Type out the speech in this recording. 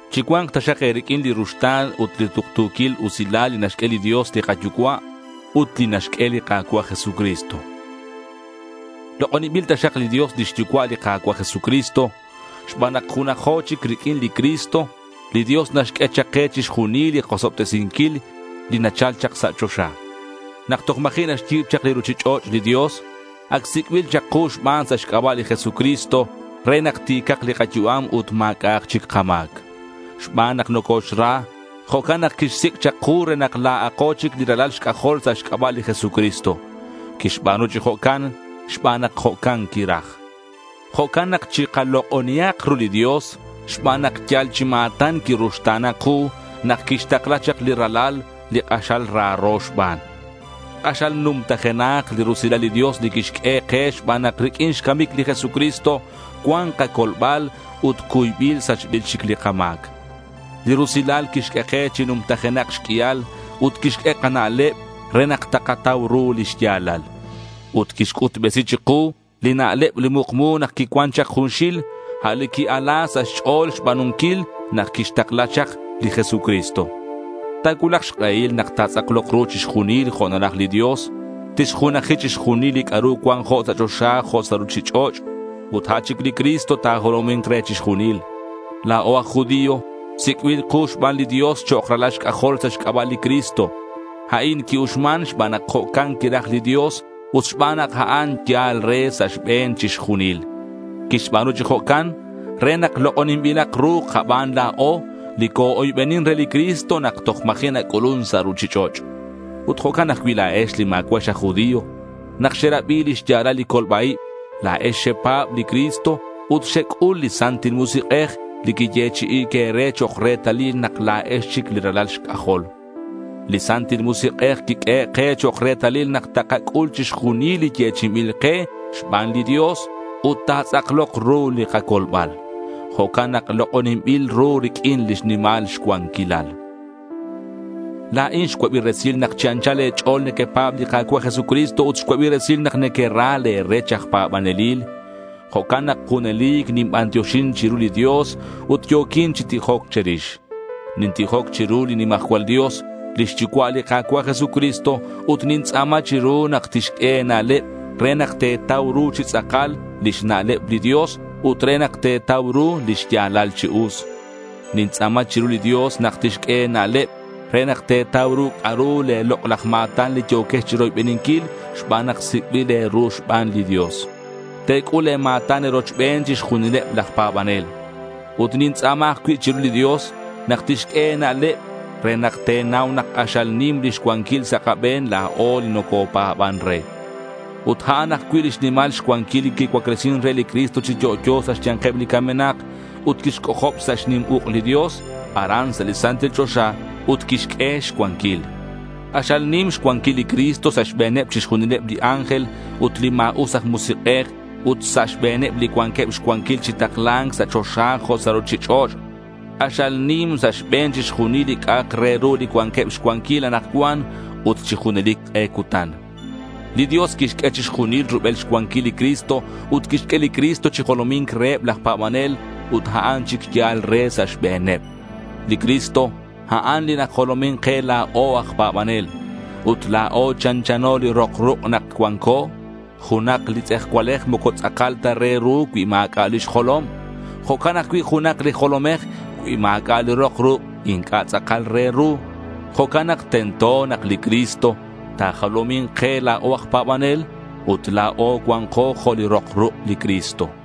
Chicua̱nk taxak e̱riq'uin li ruxta̱n ut li tuktu̱quil usilal li naxq'ue li Dios li kaYucua' ut li naxq'ue li Ka̱cua' Jesucristo. Lok'oninbil taxak li Dios lix Yucua' li Ka̱cua' Jesucristo. Xban nak junajo chic riq'uin li Cristo, li Dios naxq'ue chak ke chixjunil li kosobtesinquil li nachal chak sa' choxa. Nak toj ma̱ji' naxyi̱b chak li ruchich'och' li Dios, ac sic'bil chak ku xban sa' xc'aba' li Jesucristo, re nak ti̱cak li kayu'am ut ma̱c'a'ak chic kama̱c. Xban nak nocoxra, jo'can nak quixsic' chak ku re nak la̱ako chic li ralal xc'ajol sa' xc'aba' li Jesucristo. Quixba̱nu chi jo'can xban nak jo'can quiraj. Jo'can nak chikalok'onihak ru li Dios xban nak yal chi ma̱tan quiruxta̱na ku nak quixtakla chak li Ralal li k'axal raro xban. K'axal numtajenak li rusilal li Dios li quixq'ue ke xban nak riq'uin xcamic li Jesucristo, cuan kacolbal ut cuybil sachbil chic li kama̱c. Li rusilal quixq'ue ke chi numtajenak xq'uial ut quixq'ue kana'leb re nak takatau ru li xya̱lal. Ut quixc'utbesi chiku li na'leb li mukmu nak quicuan chak junxil, a' li qui-ala sa' xch'o̱l xba̱nunquil nak quixtakla chak li Jesucristo. Ta̱cuulak xk'ehil nak ta̱tz'aklok ru chixjunil jo' naraj li Dios. Tixjunaji chixjunil li c'a'ru cuan jo' sa' choxa jo' sa' ruchich'och'. Ut a' chic li Cristo ta̱jolomi̱nk re chixjunil. La̱o aj judío sic'bil ku xban li Dios chok' ralal xc'ajol sa' xc'aba' li Cristo. A'in qui-uxman xban nak jo'can quiraj li Dios ut xban nak a'an yal re sa' xbe̱n chixjunil. Quixba̱nu chi jo'can re nak lok'oninbilak ru kaban la̱o li co-oybenin re li Cristo nak toj ma̱ji' nac'ulun sa' ruchich'och'. Ut jo'can ajcui' la̱ex li ma̱cua'ex aj judío. Nak xerabi li xya̱lal li colba-ib, la̱ex xepa̱b li Cristo ut xec'ul li Santil Musik'ej, li quiyechi'i̱c e̱re chok' retalil nak la̱ex chic li ralal xc'ajol. Li Santil Musik'ej quiq'uehe' ke chok' retalil nak takac'ul chixjunil li yechi'inbil ke xban li Dios ut ta̱tz'aklok ru li kacolbal. Jo'can nak lok'oninbilak ru riq'uin lix nimal xcuanquilal. La̱in xcuabi resil nak chi anchal e̱ch'o̱l nequepa̱b li Ka̱cua' Jesucristo ut xcuabi resil nak nequera le̱ rech aj pa̱banelil. Jo'can nak junelic ninbantioxin chiru li Dios ut yo̱quin chi tijoc che̱rix. Nintijoc chiru li nimajcual Dios, lix yucua' li Ka̱cua' Jesucristo, ut nintz'a̱ma chiru nak tixq'ue e̱na'leb re nak te̱tau ru chi tz'akal lix na'leb li Dios ut re nak te̱tau ru li xya̱lal chi us. Nintz'a̱ma chiru li Dios nak tixq'ue e̱na'leb re nak te̱tau ru c'a'ru le̱ lok'laj ma̱tan li yo̱quex chiroybeninquil xban nak sic'bil e̱ru xban li Dios. Te̱c'ul le̱ ma̱tan e̱rochbeneb chixjunileb laj pa̱banel. Ut nintz'a̱ma ajcui' chiru li Dios nak tixq'ue e̱na'leb re nak te̱nau nak k'axal nim lix cuanquil sa' kabe̱n la̱o li nocopa̱ban re. Ut a'an ajcui' lix nimal xcuanquil li quicuaclesin re li Cristo chi yo'yo sa' xya̱nkeb li camenak ut quixc'ojob sa' xnim uk' li Dios aran sa' li santil choxa ut quixq'ue xcuanquil. K'axal nim xcuanquil li Cristo sa' xbe̱neb chixjunileb li ángel ut li ma̱us aj musik'ej ut sa' xbe̱neb li cuanqueb xcuanquil chi takla̱nc sa' choxa jo' sa' ruchich'och'. K'axal nim sa' xbe̱n chixjunil li c'a'ak re ru li cuanqueb xcuanquil anakcuan ut chi junelic k'e cutan. Li Dios quixq'ue chixjunil rubel xcuanquil li Cristo ut quixq'ue li Cristo chi jolomi̱nc reheb laj pa̱banel ut a'an chic yal re sa' xbe̱neb. Li Cristo a'an li najolomin ke la̱o aj pa̱banel. Ut la̱o chanchano li rok ruk' nak cuanco. Junak li tz'ejcualej moco tz'akal ta re ru cui ma̱c'a' lix jolom. Jo'can ajcui' junak li jolomej, cui ma̱c'a' li rok ruk' inc'a' tz'akal re ru. Jo'can nak tento nak li Cristo ta̱jolomi̱nk ke la̱o aj pa̱banel ut la̱o cua̱nko jo' li rok ruk' li Cristo.